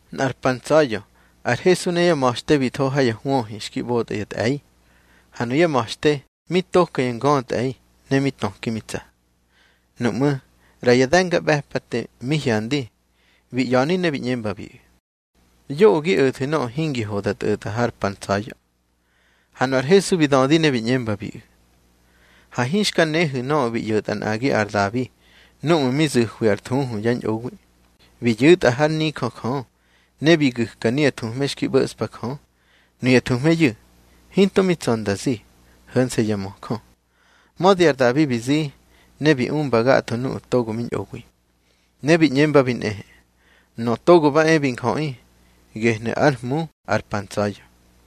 Nꞌar pa ntsa̱ya̱ ar Hesu ne yá ma̱xte bi tho ha ya hwöhi xki ꞌbotꞌa ya tꞌe̱i, ha nuyá ma̱xte mi toka ya ngötꞌe̱i, ne mi töki mi tsa. Nuꞌmú̱ ꞌra ya de̱ngaꞌbe̱pate mi hyandi, bi ꞌya̱ni ne bi ꞌñembabiꞌu̱: —Yoꞌö gi o̱thu̱ nöꞌö hingi ho da tꞌo̱tꞌa har pa ntsa̱ya̱. Ha nu ar Hesu bi dödi ne bi ꞌñembabiꞌu̱: —Ha hinxka nehu̱ nöꞌö bi ꞌyo̱tꞌa nꞌagi ar Dabi núꞌmu̱ mi zu̱hwi ar thuhu yá ñꞌowi. Bi yu̱tꞌa hár nijö Jö, ne bi gu̱ka nuya thuhme xki ꞌbo̱ꞌspa Jö. Nuya thuhmeyu̱, hinto mi tsa̱ nda zi, ho̱nse̱ ya möjö. Mödi ar Dabi bi zi, ne bi umbabi gatho nuꞌu̱ togo mi ñꞌowi. Ne bi ꞌñembabi nꞌehe: —Nöꞌö Togo ba e bi Njöꞌi, gehnu̱ ár Hmu ar pa ntsa̱ya̱.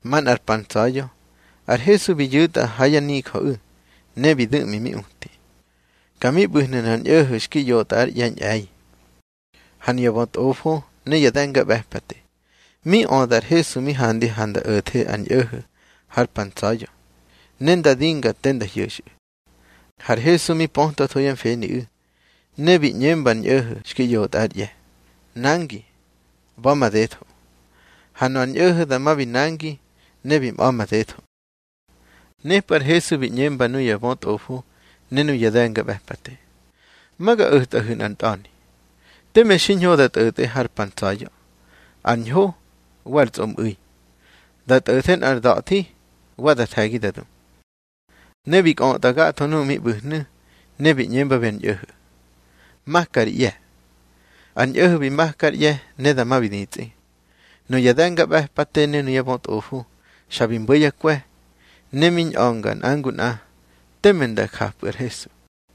Manꞌar pa ntsa̱ya̱ ar Hesu bi yu̱tꞌa ha yá nijöꞌu̱, ne bi du̱ꞌmi mi uti. Ka mi ꞌbu̱hnu̱ nꞌar ñꞌo̱ho̱ xki ꞌyotꞌa ár ꞌye̱ ñꞌe̱i. Ha nuya bötꞌofo ne ya de̱ngaꞌbe̱pate, mi öda ar Hesu mi handi ha nda o̱the ar ñꞌo̱ho̱ har pa ntsa̱ya̱, ne nda dinga te nda hyo̱xꞌu̱. Har Hesu mi pötwatho yá mfeniꞌu̱, ne bi ꞌñemba ar ñꞌo̱ho̱ xki ꞌyotꞌa ár ꞌye̱: —Nangi, ꞌba̱ madetho. Ha nöꞌö ar ñꞌo̱ho̱ dama bi nangi, ne bi mꞌa̱ madetho. Nepꞌu̱ ar Hesu bi ꞌñembabi nuya bötꞌofo ne nuya de̱ngaꞌbe̱pate: —Ma ga o̱tꞌahu̱ nꞌar ntꞌa̱ni: Teme xiñho da tꞌo̱tꞌe har pa ntsa̱ya̱, ar ñho wa ar tsꞌomꞌu̱i. Da tꞌo̱the nꞌar da̱thi, wa da the̱gi da du. Ne bi kꞌötꞌa gatho nuꞌu̱ mi ꞌbu̱hnu̱, ne bi ꞌñembabi ar ñꞌo̱ho̱: —Maka ri ꞌye̱. Ar ñꞌo̱ho̱ bi maka ár ꞌye̱, ne dama bi ditsꞌi. Nuya de̱ngaꞌbe̱pate ne ya bötꞌofo xa bi mbo̱ yá kwe̱, ne mi ñꞌa̱nga nꞌa ngu nꞌa teme nda japꞌu̱ ar Hesu.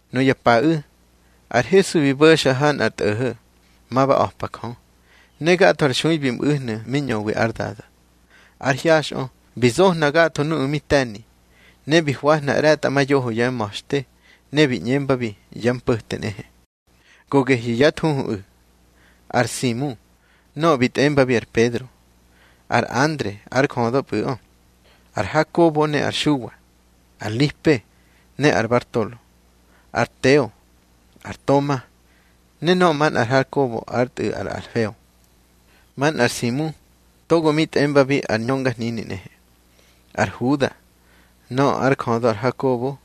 Nuya paꞌu̱ ar Hesu bi bo̱xa ha nꞌar tꞌo̱ho̱, ma ba a̱pa Jö, ne gatho ar xui bi mꞌu̱hnu̱ mi ñöwi ár Dada. Ár hyaxꞌö bi zohna gatho nuꞌu̱ mi te̱ni. Ne bi hwahna ꞌre̱tꞌamayoho yá ma̱xte, ne bi ꞌñembabi yá mpo̱te nꞌehe. Go gehyu̱ yá thuhuꞌu̱: ar Simu nöꞌö bi tꞌembabi ar Pedro, ar Andre ár jödöpꞌu̱ꞌö, ar Hakobo ne ar Xuwa, ar Lipe, ne ar Bartolo, ar Teo, ar Toma, ne nöꞌö manꞌar Hakobo ár tꞌu̱ ar Alfeo, manꞌar Simu togo mi tꞌembabi ar ñöngahnini nꞌehe, ar Huda nöꞌö ár jödö ar Hakobo,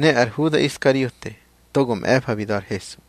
ne ar Huda Iskariote togo mꞌe̱fa bi da̱ ar Hesu.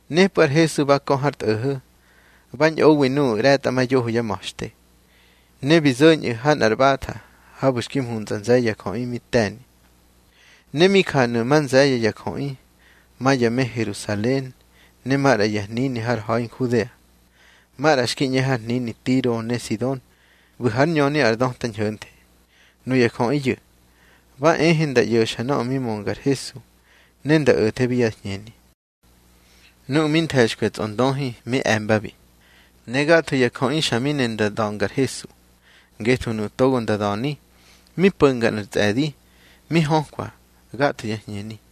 Nepꞌu̱ ar Hesu ba kö har tꞌo̱ho̱, ba ñꞌowi nuꞌu̱ ꞌre̱tꞌamayoho yá ma̱xte. Ne bi zo̱ñꞌu̱ ha nꞌar ꞌbatha habu̱ xki mhuntsꞌa nze̱ye̱ ya jöꞌi mi te̱ni. Ne mi janu̱ ma nze̱ye̱ ya jöꞌi, ma ya me Herusalen ne maꞌra ya hnini har ha̱i Nhudea, maꞌra xki ꞌñe har hnini Tiro ne Sidon ꞌbu̱ hár ñöni ar döta ñho̱nthe. Nuya jöꞌiyu̱ ba ehe nda ꞌyo̱xa nöꞌö mi mönga ar Hesu, ne nda o̱thebi yá hñeni. Nuꞌu̱ mi nthe̱xkwi ya tsꞌondöhi mi e̱mbabi. Ne gatho ya jöꞌi xa mi ne nda da̱nga ar Hesu, ngetho nuꞌu̱ togo nda da̱ni, mi po̱nga nꞌar tsꞌe̱di mi hökwa gatho yá hñeni.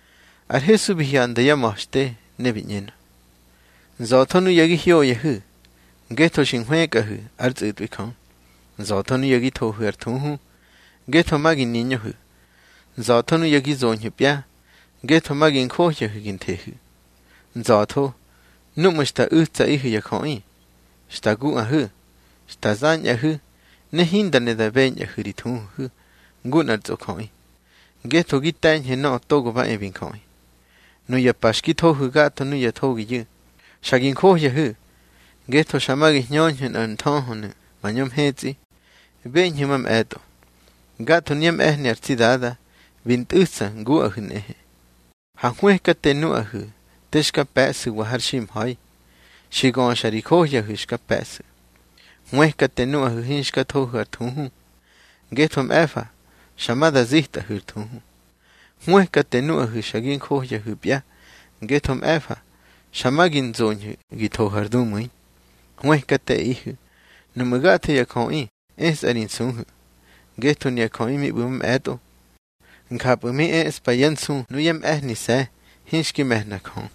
Ar Hesu bi hyanda yá ma̱xte, ne bi ꞌñenö: —Nza̱tho nuya gi hyoyahu̱, ngetho xi nhwëkꞌahu̱ ár tsꞌu̱tꞌwi Jö. Nza̱tho nuya gi thohu̱ ar thuhu, ngetho ma gi niñöhu̱. Nza̱tho nuya gi zoñhu̱pya, ngetho ma gi njohya gi nthehu̱. Nza̱tho núꞌmu̱ xta u̱tsaꞌihu̱ ya jöꞌi, xta guꞌahu̱, xta zañꞌahu̱, ne hinda ne da beñꞌahu̱ ri thuhuhu̱ ngu nꞌar tsꞌojöꞌi, ngetho gi te̱ñhu̱ Nöꞌö Togo ba e bi Njöꞌi. Nuya pa xki thohu̱ gatho nuya thogiyu̱, xa gi njohyahu̱, ngetho xa ma gi hñöñhu̱ nꞌar nthöhönu̱ mañö mhetsꞌi. Beñhu̱ mamꞌe̱tꞌo, gatho nuyá mꞌe̱hni ar tsi Dada bi ntꞌu̱tsa nguꞌahu̱ nꞌehe. Ha hwëkate nuꞌahu̱ te xka pe̱ꞌsu̱wa har ximha̱i. Xi göxa ri johyahu̱ xka pe̱ꞌsu̱. Hwëkate nuꞌahu̱ hinxka thohu̱ ar thuhu, ngetho mꞌe̱fa xa ma da zitꞌahu̱ ar thuhu. Hwëkate nuꞌahu̱ xa gi johyahu̱pya, ngetho mꞌe̱fa xa ma gi nzoñhu̱ gi thohu̱ ar dumu̱i. Hwëkateꞌihu̱ nuꞌmu̱ gatho ya jöꞌi esꞌahu̱ ri nsuhu̱, ngetho nuya jöꞌi mi ꞌbu̱ mamꞌe̱tꞌo, njapꞌu̱ mi eꞌspa yá nsu nuyá mꞌe̱hnise̱ hinxki me̱hna Jö.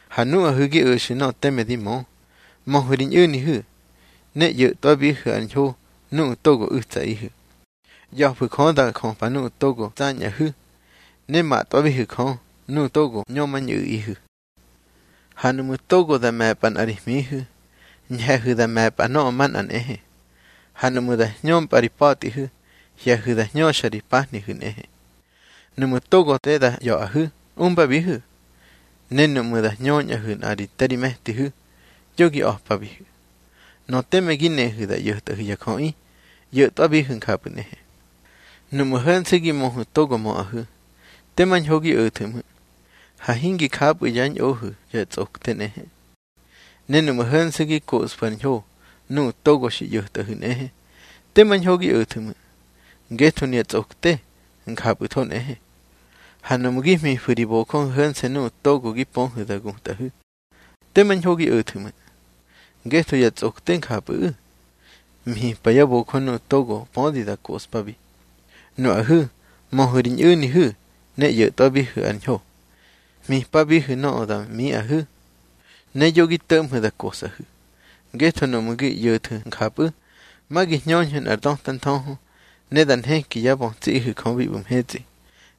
Ha nuꞌahu̱ gi o̱xu̱ nöꞌö teme di mö, möhu̱ ri ñꞌu̱nihu̱, ne ꞌyo̱tꞌwabihu̱ ar ñho nuꞌu̱ togo u̱tsaꞌihu̱. ꞌYa̱fu̱ Jö da jöpa nuꞌu̱ togo tsañꞌahu̱, ne matꞌwabihu̱ Jö nuꞌu̱ togo ñömañꞌu̱ꞌihu̱. Ha nuꞌmu̱ togo da me̱pꞌa nꞌa ri hmihu̱, ñhe̱hu̱ da me̱pꞌa nöꞌö manꞌa nꞌehe. Ha nuꞌmu̱ da hñömpꞌa ri pa̱tꞌihu̱, hye̱hu̱ da hñöxa ri pahnihu̱ nꞌehe. Nuꞌmu̱ togo te da ꞌya̱ꞌahu̱, umbabihu̱. Ne nuꞌmu̱ da hñöñꞌahu̱ nꞌa te ri me̱tihu̱, yo gi a̱pabihu̱. Nöꞌö teme gi nehu̱ da ꞌyo̱tꞌahu̱ ya jöꞌi, ꞌyo̱tꞌwabihu̱ njapꞌu̱ nꞌehe. Nuꞌmu̱ ho̱nse̱ gi möhu̱ togo möꞌahu̱, tema ñho gi o̱thu̱ ꞌmu̱. Ha hingi japꞌu̱ yá ñꞌohu̱ ya tsꞌokte nꞌehe. Ne nuꞌmu̱ ho̱nse̱ gi koꞌsfu̱ ar ñho nuꞌu̱ togo xi ꞌyo̱tꞌahu̱ nꞌehe, tema ñho gi o̱thu̱ ꞌmu̱. Ngetho nuya tsꞌokte njapꞌu̱tho nꞌehe. Ha nuꞌmu̱ gi hmifu̱ ri bojöhu̱ ho̱nse̱ nuꞌu̱ togo gi pöhu̱ da gutꞌahu̱, tema ñho gi o̱thu̱ ꞌmu̱. Ngetho ya tsꞌokte njapꞌu̱ꞌu̱, hmipa yá bojö nuꞌu̱ togo pödi da koꞌspabi. Nuꞌahu̱ möhu̱ ri ñꞌu̱nihu̱ ne ꞌyo̱tꞌwabihu̱ ar ñho. Hmipabihu̱ nöꞌö da miꞌahu̱, ne yo gi to̱ꞌmhu̱ da kosꞌahu̱. Ngetho nuꞌmu̱ gi ꞌyo̱thu̱ njapꞌu̱, ma gi hñöñhu̱ nꞌar döta nthöhö, ne da nheki yá bötsiꞌihu̱ Jö bi ꞌbu̱ mhetsꞌi.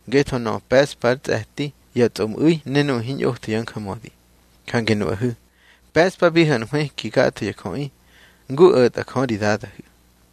Ngetho nöꞌö pe̱ꞌspa ar tsꞌe̱ti ya tsꞌomꞌu̱i ne nuꞌu̱ hiñꞌotho yá njamödi. Jange nuꞌahu̱ pe̱ꞌspabihu̱ ar hwëki gatho ya jöꞌi, ngu o̱tꞌa Jö ri Dadahu̱.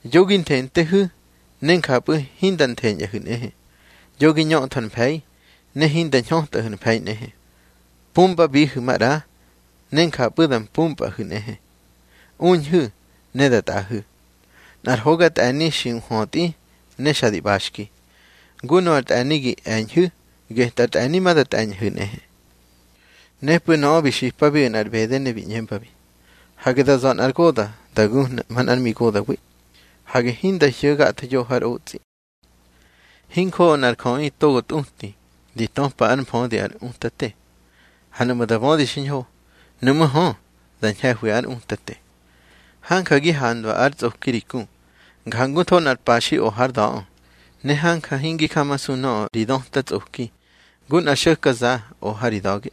Yo gi nthentehu̱, ne njapꞌu̱ hinda ntheñꞌahu̱ nꞌehe. Yo gi ñöthu̱ ar mfe̱i, ne hinda ñhötꞌahu̱ ar mfe̱i nꞌehe. Pumbabihu̱ maꞌra, ne njapꞌu̱ da mpumpꞌahu̱ nꞌehe. Uñhu̱, ne da tꞌaꞌahu̱, nꞌar hoga tꞌe̱ni xi nhwötꞌi ne xa di ꞌbaxki. Ngu nöꞌö ar tꞌe̱ni gi e̱ñhu̱, getꞌar tꞌe̱ni ma da tꞌe̱ñꞌahu̱ nꞌehe. Nepꞌu̱ nöꞌö bi xipabiꞌu̱ nꞌar ꞌbede, ne bi ꞌñembabi: —Hage da za̱ nꞌar goda̱ da gu̱hna manꞌár migoda̱wi. Hage hinda hyo̱ gatho yoho har otsꞌi. Hinjoꞌo nꞌar jöꞌi togo tꞌuti di töpa ár mfödi ár utate. Ha nuꞌmu̱ da bödi xiñho, nuꞌmú̱ hö, da ñhe̱hwi ár utate. Hanja gi handwa ár tsꞌoki ri ku, njangutho nꞌar paxi o hár da̱ꞌö, ne hanja hingi jamasu nöꞌö ri döta tsꞌoki ngu nꞌar xo̱ka za o ha ri da̱ge.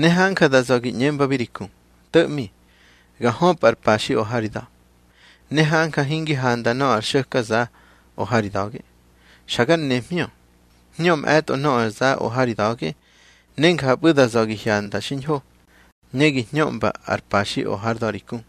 Ne hanja da za̱ gi ꞌñembabi ri ku: To̱ꞌmi ga höpꞌa ar paxi o ha ri da̱. Ne hanja hingi handa nöꞌö ar xo̱ka za o ha ri da̱ge. Xa gar nemhñö. Hñö mꞌe̱tꞌo nöꞌö ar za o ha ri da̱ge, ne njapꞌu̱ da za̱ gi hyanda xiñho, ne gi hñöꞌmba ar paxi o hár da̱ ri ku.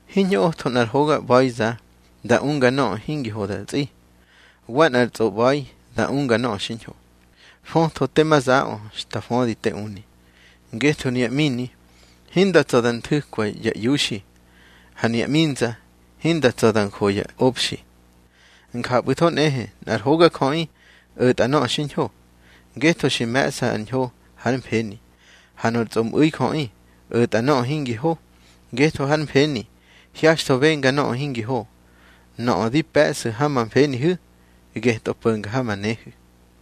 Hiñꞌotho nꞌar hoga ꞌba̱iza da unga nöꞌö hingi ho da tsꞌi, wa nꞌar tsꞌoꞌba̱i da unga nöꞌö xiñho. Föta tema zaꞌö xta födi te uni. Ngetho nuya ꞌmini hinda tsa̱ da nthu̱kwa ya iuxi, ha nuya ꞌminza hinda tsa̱ da njo ya obxi. Njapꞌu̱tho nꞌehe nꞌar hogajöꞌi o̱tꞌa nöꞌö xiñho, ngetho xi me̱ꞌsa ar ñho hár mfeni. Ha nor tsꞌomꞌu̱i jöꞌi o̱tꞌa nöꞌö hingi ho, ngetho hár mfeni hyaxtho benga nöꞌö hingi ho. Nöꞌö di pe̱ꞌsu̱ ha ma mfenihu̱, geꞌö po̱nga ha ma nehu̱.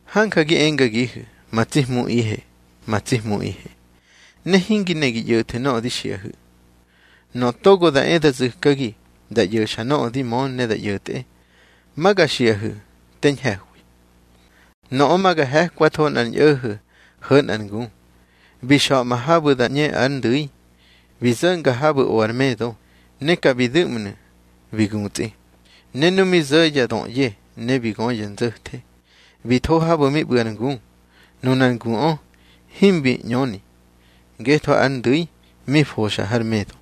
Hanja gi engagihu̱: Ma tsi Hmuꞌihe, ma tsi Hmuꞌihe, ne hingi ne gi ꞌyo̱thu̱ nöꞌö di xiꞌahu̱. Nöꞌö togo da e da zu̱kagi, da ꞌyo̱xa nöꞌö di mö ne da ꞌyo̱tꞌe, ma ga xiꞌahu̱ te ñhe̱hwi. Nöꞌö ma ga he̱kwatho nꞌar ñꞌo̱ho̱ ho̱ nꞌar ngu. Bi xa̱ꞌma habu̱ da ꞌñe ár ndu̱i, bi zo̱nga habu̱ o ar medo, ne ka bi du̱ꞌmnu̱ bi gutsꞌi. Ne nu mi zo̱ ya döꞌye, ne bi gö ya nzo̱the, bi tho habu̱ mi ꞌbu̱ ar ngu. Nunar nguꞌö himbi ꞌñöni, ngetho ár ndu̱i mi foxa har medo.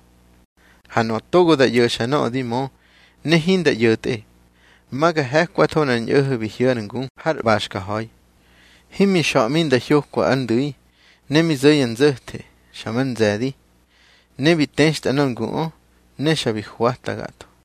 Ha nöꞌö togo da ꞌyo̱xa nöꞌö di mö ne hinda ꞌyo̱tꞌe, ma ga he̱kwatho nꞌar ñꞌo̱ho̱ bi hyo̱ ár ngu har ꞌbaxka ha̱i, himbi xa̱ꞌmi nda hyokwa ár ndu̱i. Ne mi zo̱ ya nzo̱the, xa mar nze̱di, ne bi textꞌa nor nguꞌö, ne xa bi hwata gatho.